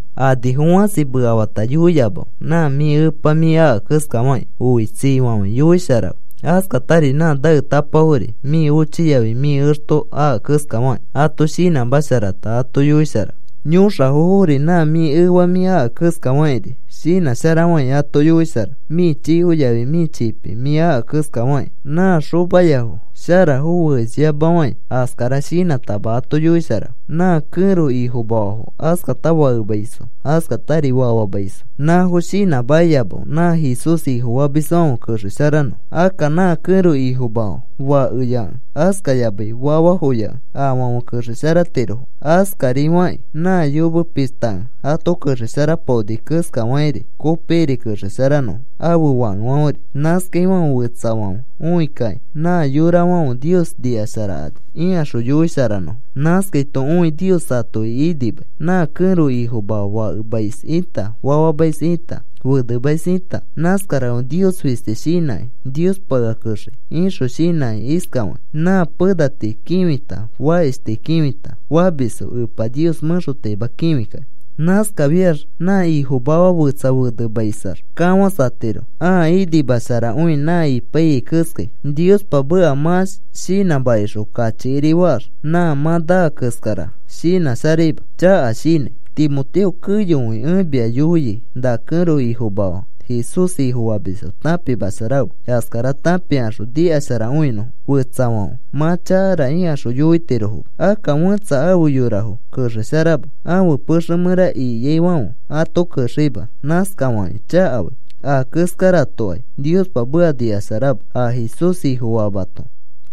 Anifo fãsi mekafata yoiyamafe. Nã mĩ epa mĩ aka keskafakĩ, oitsifafãi yoisharafe. Askatari nã naetapafori mĩ ochi yafi mĩ exto aka keskafakĩ ato shinãmasharata ato yoisharafe. Yõxafofori nã mĩ efa mĩ aka keskafakĩri shinãsharafãi ato yoisharafe. Mĩ chiko yafi mĩ chipi mĩ aka keskafakĩ nã xomayafo sharafo feesyamafãi, askara shinãtama ato yoisharafe. Nã kẽro ifomafafo, askata fakemaisfo, askatari fafamaisfo, nãfo shinãmakiyamafe nã Jesús Ifofamisfãfe kexesharanõfo. Akka nã kẽro ifomafa fakeyakẽ, askayamai fafafoyakẽ afãfe kexesharatirofo. Askarifakĩ nã yome pishtakẽ ato kexesharapaonifo keskafakĩri kopikiri kexesharanõfo ãfe fakefãferi. Nãskafaifãfe fetsafãfe õi kakĩ, “Nã yorafãfe Nios nikasharakani,” ikaxõ yoisharanõfo. Nãskaito õi Nios atoki inimai. Nã kẽro ifomafa fakemais ita, fafamais ita, fenemais ita, nãskarafãfe Nios fisti shinãkĩ: “Niospa ea kexei,” ixõ shinãkĩ iskafakĩ, nã pena tii kĩfita fakish tii kĩfita famisfo Epa Nios mẽxotaima kĩfikakĩ. Nãskafiax nã ifomafa fetsa fenemaisax kafãsatiro. Aa inimasharakõi nã ipaiyai keskai. Niospa meka mã shinãmakixõ, kachikiri faax, nã mã naa keskara. Shinãsharaima, chaka shinãi. Timoteo, keyokõi ẽ mia yoiai na kẽro ifomafa Jesús Ifofamisfo tãpimasharafe, askara tãpikaxõ nikasharakõinõfo, fetsafãfe, “Mã chakara,” ikaxõ yoitirofoma. Akka fẽtsa afe yorafo kexesharama, ãfe pexe mẽra ikiaifãfe ato kexeima nãskafakĩ chakafai. Aa keskaratokai Niospa meka nikasharama. A Jesús Ifofamato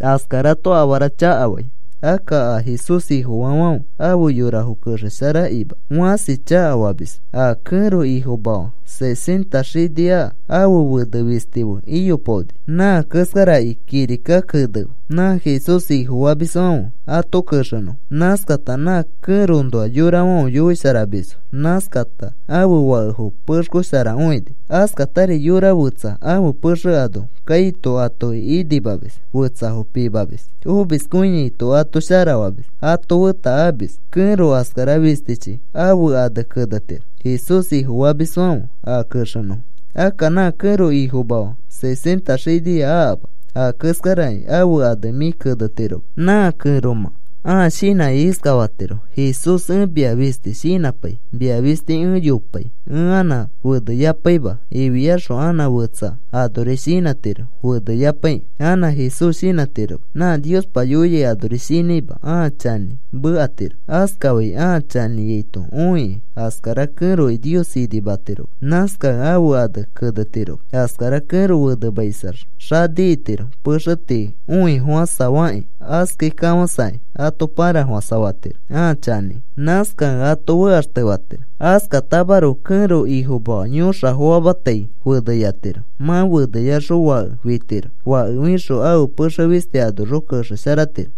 askarato afara chakafai, akka a Jesús Ifofaafãfe afe yorafo kexesharakakĩma fãsi chakafamisfo. A kẽro ifomafa sesenta xini aka, ãfe fene fisti fe iyopaoni nã keskaraki kirika kenefe nã Jesús Ifofamisfãfe ato kexenõfo. Nãskata nã kẽroõnoa yorafãfe yoisharamisfo; nãskata ãfe fakefo pexkosharakõini; askatari yora fetsa ãfe pexe ano kaito atoki inimamis; fetsafo pimamis; omiskõiaito ato sharafamis; ato feta amis; kẽro askara fistichi ãfe ane kenetiro Jesús Ifofamisfãfe a kexenõfo. Akka nã kẽro ifomafa sesenta xinia akama, a keskaraki ãfe ane mĩ kenetiroma. Nã kẽromã ãa shinãkĩ iskafatiro: “Jesús, ẽ mia fisti shinãpai. Mia fisti ẽ yopai. Ẽ anã feneyapaima,” ifiaxõ anã fetsa anori shinãtiro feneyapaikĩ, anã Jesús shinãtiroma. Nã Niospa yoiai anori shinãima ãa chanĩ mekatiro. Askafai ãa chanĩaito õikĩ, askara kẽroki Nios inimatiroma. Nãskakẽ ãfe ane kenetiroma. Askara kẽro fenemaisax xani itiro, pexe tii õifofãsafakĩ, askai kafãsakĩ, ato pãrafofãsafatiro ãa chanĩkĩ. Nãskakẽ ato fekaxtefatiro. Askatamaroko kẽro ifomafa yõxafo famatai feneyatiro. Mã feneyaxõ fake fitiro. Fake fixõ ãfe pexe fisti anoxõ kexesharatiro.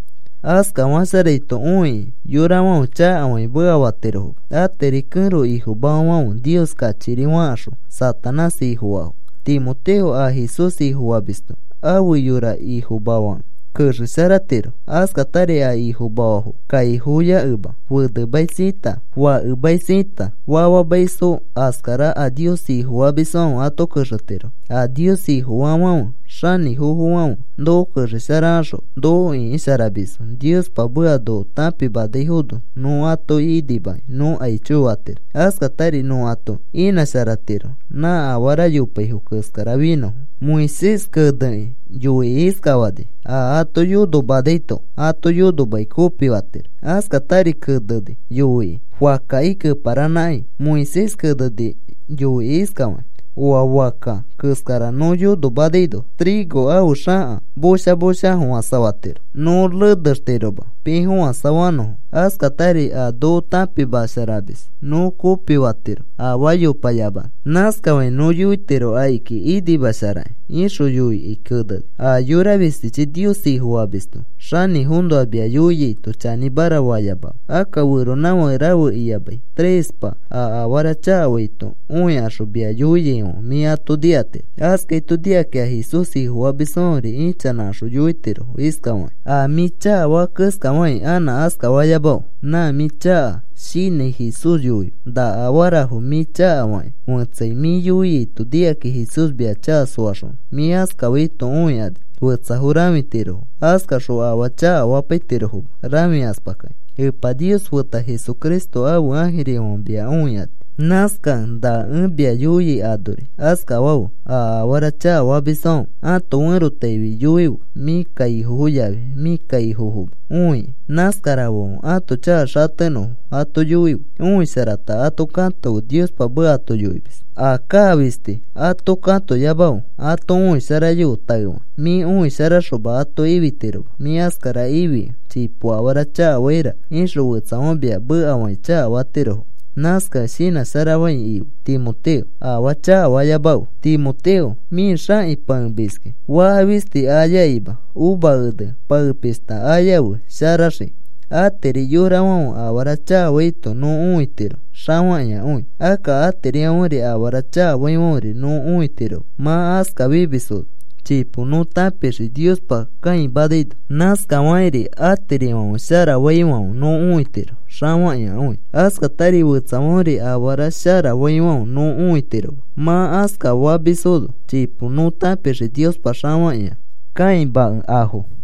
Askafasharaito õikĩ yorafãfe chakafakĩ mekafatirofoma. Atiri kẽro ifomafafãfe Nios kachikiri fakaxõ Satanás ifofaafo. Timoteo, a Jesús Ifofamisto afe yora ifomafakẽ, kexesharatiro. Askatari a ifomafafo kaifoyakẽma, fenemais ita, fakemais ita, fafamaisfo askara a Nios Ifofamisfãfe ato kexetirofo. A Nios Ifofaafãfe xanĩfofofãfe noko kexesharakaxõ noko ĩkisharamisfo Niospa meka noko tãpimanaifono nõ atoki inimakĩ nõ aicho fatiro. Askatari nõ ato inãsharatiro nã afara yopaifo keskara finõfo. Moisés kenekĩ yoikĩ iskafani: “A ato yonomanaito ato yonomakĩ kopifatiro.” Askatari keneni yoikĩ fakkaki keparanãkai. Moisés keneni yoikĩ iskafakĩ: “Oa fakka keskara nõ yonomanaino trigo ãfe xaka chona chona a fofãsafatiro nõ renextiroma piifofãsafanõfo. Askatari a noko tãpimasharamis nõ kopifatiro afaa yopayamanõ. Nãskafakĩ nõ yoitiro akiki inimasharakĩ,” ixõ yoikĩ keneni. A yora fistichi Nios Ifofamisto xanĩfoõnoa mia yoiaito, chanĩmara fayamafe. Akka feronãfake rafe iyamai trespa a afara chakafaito õikaxõ, mia yoiaifãfe mĩ ato nikatiro. Askaito nikakĩ a Jesús Ifofamisfãferi ichanãkaxõ yoitirofo iskafakĩ: “A mĩ chakafaa keskafakĩ anã askafayamafe. Nã mĩ chaka shinãi, Jesús yoife na afarafo mĩ chakafakĩ fetsai, mĩ yoiaito nikakĩ Jesús mia chaka soaxonõ.” Mĩ askafaito õikani fetsafo rãfitirofo. Askaxõ afaa chakafapaitirofoma rãfikaspakakĩ. Epa Nios feta Jesucristo ãfe ãjirifãfe mia õikani. Nãskakẽ na ẽ mia yoiai anori askafafe. A afara chakafamisfãfe ãto ferotaifi yoife. Mĩ kaifofo yafi mĩ kaifofoma õikĩ, nãskarafãfe ãto chaka xatenõfo ato yoife. Õisharata ato katofe Niospa meka ato yoimis. A kaa fisti ato katoyamafe. Ato õisharayofe taefakĩ. Mĩ õisharaxoma ato ifitiroma. Mĩ askara ifikẽ chipo afara chakafaira ixõ, fetsafãfe mia mekafakĩ chakafatirofo. Nãskakẽ shinãsharafãi ife, Timoteo. Afaa chakafayamafe. Timoteo, mĩ xãki pãemiski faka fisti ayakima uva ene pãepishta ayafe sharaxikĩ. Atiri yorafãfe afara chakafaito nõ õitiro xafakĩakõi. Akka atirifãferi afara chakafaifãferi nõ õitiroma. Mã askafimisfono chipo nõ tãpixii Niospa kãimanaino. Nãskarifakĩ atirifãfe shara faifãfe nõ õitiro xafakĩakõi. Askatari fetsafãferi afara shara faifãfe nõ õitiroma. Mã askafamisfono chipo nõ tãpixii Niospa xafakĩakõi kãimakẽ afo.